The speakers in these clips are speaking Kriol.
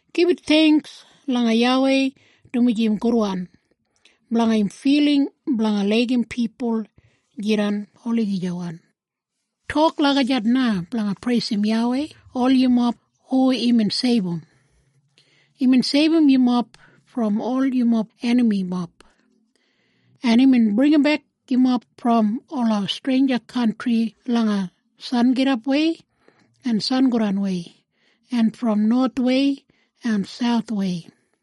“Gibit theingks langa YAWEI dumaji im gudwan. Blanga im filing blanga laigim pipul jidan olagijawan.” Tok lagijat na blanga preisim YAWEI ol yumob hu imbin seibum. Imbin seibum yumob brom ol yumob enamimob, en imbin bringimbek yumob brom ola streinja kantri langa sangidapwei en sangodanwei en brom nowathwei en sauthwei.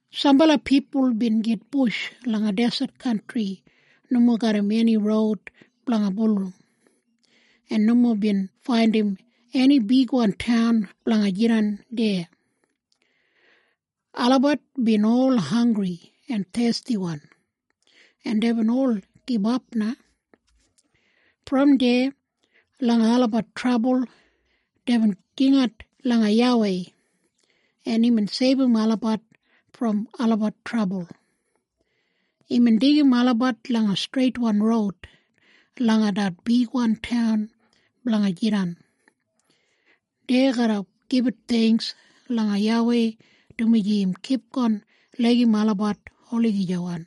Sambala pipul bin gitbush langa deset kantri nomo garram eni roud blanga bulurrum, en nomo bin faindim eni bigwan taun blanga jidan deya. Olabat bin ol hanggri en thestiwan, en deibin ol gibap na. Brom deya langa olabat trabul, deibin jingat langa YAWEI, en imbin seibum olabat brom olabat trabul. Imbin deigim olabat langa streitwan roud langa det bigwan taun blanga jidan. Dei garra gibit theingks langa YAWEI dumaji im kipgon laigim olabat olagijawan,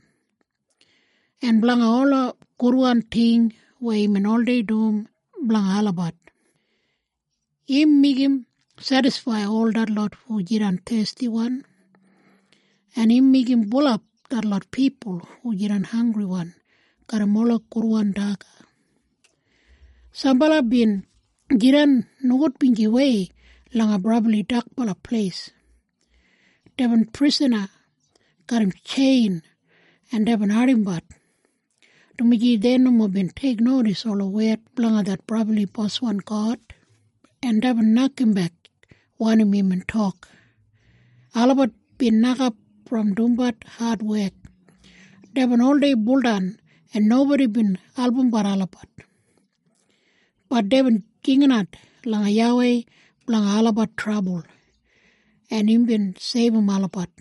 en blanga ola gudwan ting weya imbin oldei dum blanga olabat. Im meigim sedisfaid ol detlot hu jidan thestiwan, en im meigim bulap detlot pipul hu jidan hanggriwan garram ola gudwan daga. Sambala bin jidan nogudbinjiwei langa brabli dakbala pleis. Deibin prisana garram tjein en deibin ardimbat, dumaji dei nomo bin teiknodis ola wed blanga det brabli Boswan God, en deibin nokambek wanim imbin tok. Olabat bin nokap brom dumbat adwek. Deibin oldei buldan en nobodi bin albumbat olabat. Bat deibin jinginat langa YAWEI blanga olabat trabul, en imbin seibum olabat.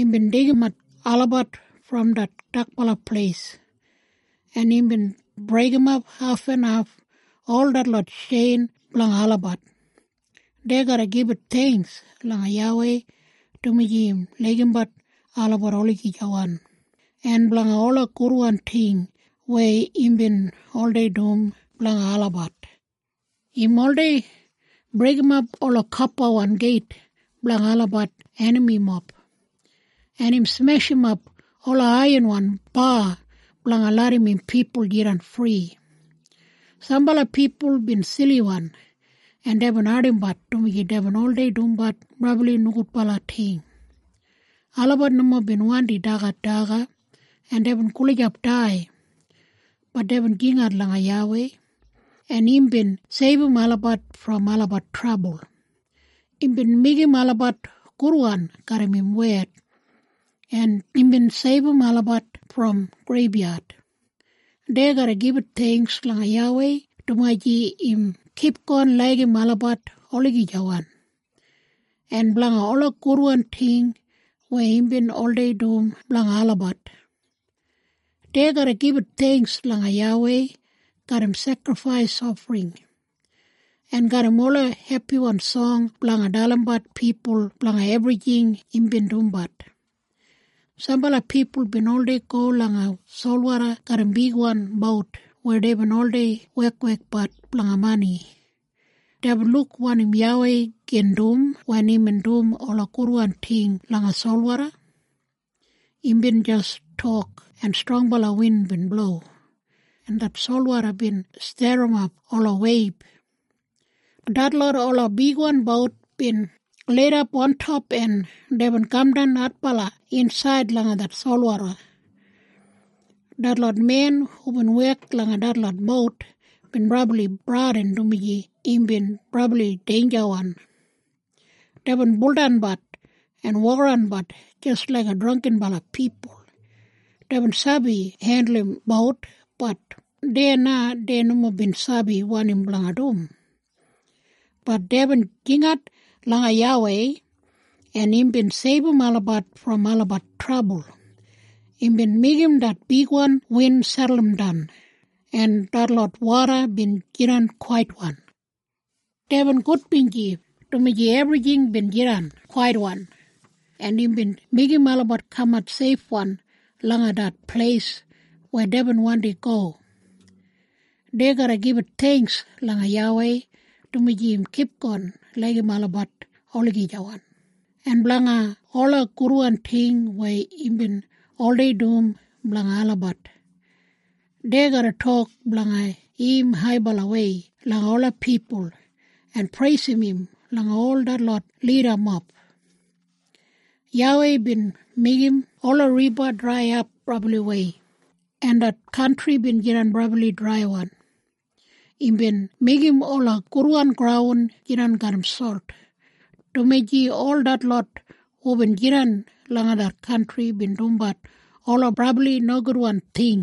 Imbin deigimat olabat brom det dakbala pleis, en imbin breigimap hafenhaf ol detlot tjein blanga olabat. Dei garra gibit theingks langa YAWEI dumaji im laigimbat olabat olagijawan, en blanga ola gudwan ting weya imbin oldei dum blanga olabat. Im oldei breigimap ola kopawan geit blanga olabat enamimob, en im smeshimap ola aiyanwan ba blanga larram im pipul jidan fri. Sambala pipul bin siliwan, en deibin ardimbat dumaji deibin oldei dumbat brabli nogudbala ting. Olabat nomo bin wandi dagat daga en deibin gulijap dai. Bat deibin jingat langa YAWEI, en imbin seibum olabat brom olabat trabul. Imbin meigim olabat gudwan garram im wed, en imbin seibum olabat brom greibyad. Dei garra gibit theingks langa YAWEI dumaji im kipgon laigim olabat olagijawan, en blanga ola gudwan ting weya imbin oldei dum blanga olabat. Dei garra gibit theingks langa YAWEI garram sekrifais ofring, en garram ola hepiwan song blanga dalimbat pipul blanga ebrijing imbin dumbat. Sambala pipul bin oldei go langa solwoda garram bigwan bout weya deibin oldei wekwekbat blanga mani. Deibin luk wanim YAWEI gin dum wen imbin dum ola gudwan ting langa solwoda. Imbin jis tok en strongbala win bin blo, en det solwoda bin sterrimap ola weib. Detlot ola bigwan bout bin lidap ontop en deibin kamdan adbala insaid langa det solwoda. Detlot men hubin wek langa detlot bout bin brabli bradin dumaji imbin brabli deinjawan. Deibin buldanbat en wokaranbat jis laik drangginbala pipul. Deibin sabi hendulum bout, bat deya na dei nomo bin sabi wanim blanga dum. Bat deibin jingat langa YAWEI, en imbin seibum olabat brom olabat trabul. Imbin meigim det bigwan win seduldan, en detlot woda bin jidan kwaitwan. Deibin gudbinji dumaji ebrijing bin jidan kwaitwan, en imbin meigim olabat kamat seifwan langa det pleis weya deibin wandi go. Dei garra gibit theingks langa YAWEI dumaji im kipgon laigim olabat olagijawan, en blanga ola gudwan ting weya imbin oldei dum blanga olabat. Dei garra tok blanga im haibalawei langa ola pipul, en preisim im langa ol detlot lidamob. YAWEI bin meigim ola riba draiyap brabliwei, en det kantri bin jidan brabli draiwan. Imbin meigim ola gudwan graun jidan garram solt, dumaji ol detlot hubin jidan langa det kantri bin dumbat ola brabli nogudwan ting.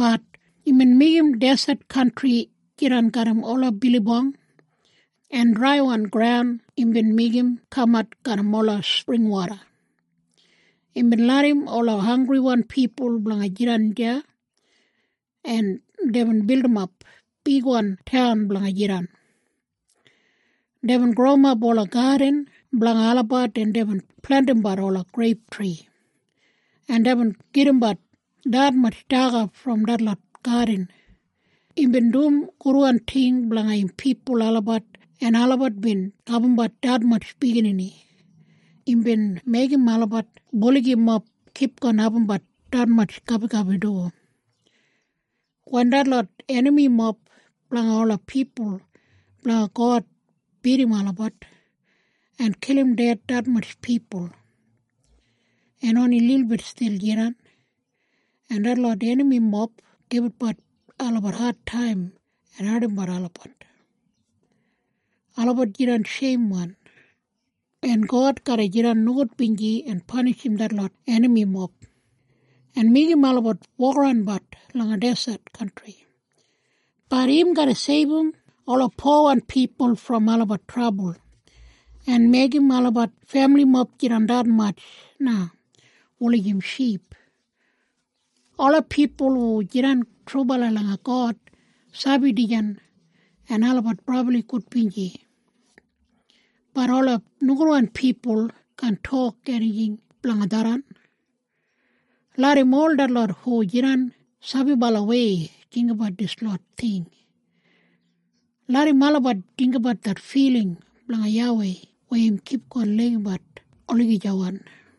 Bat imbin meigim deset kantri jidan garram ola bilibong, en draiwan graun imbin meigim kamat garram ola springwoda. Imbin larram ola hanggriwan pipul blanga jidan deya, en deibin bildimap bigwan taun blanga jidan. Deibin growimap ola gadin blanga olabat en deibin plentimbat ola greiptri, en deibin gedimbat detmatj daga brom detlot gadin. Imbin dum gudwan ting blanga im pipul olabat en olabat bin abumbat detmatj biginini. Imbin meigim olabat buligimob kipgon abumbat detmatj gabigabi du. Wen detlot enamimob blanga ola pipul blanga God bidim olabat, en kilim ded detmatj pipul, en oni lilbit stil jidan, en detlot enamimob gibitbat olabat adtaim en ardimbat olabat, olabat jidan sheimwan. En God garra jidan nogudbinji en panishim detlot enamimob, en meigim olabat wokaranbat langa deset kantri. Bat im garra seibum ola powan pipul brom olabat trabul, en meigim olabat femilimob jidan detmatj na, wulijim ship. Ola pipul hu jidan trubala langa God sabi dijan, en olabat brabli gudbinji. Bat ola nogudwan pipul kaan tok enijing blanga tharran. Larram ol detlot hu jidan sabibalawei jinggabat dislot ting. Larram olabat jinggabat det filing blanga YAWEI weya im kipgon laigimbat olagijawan.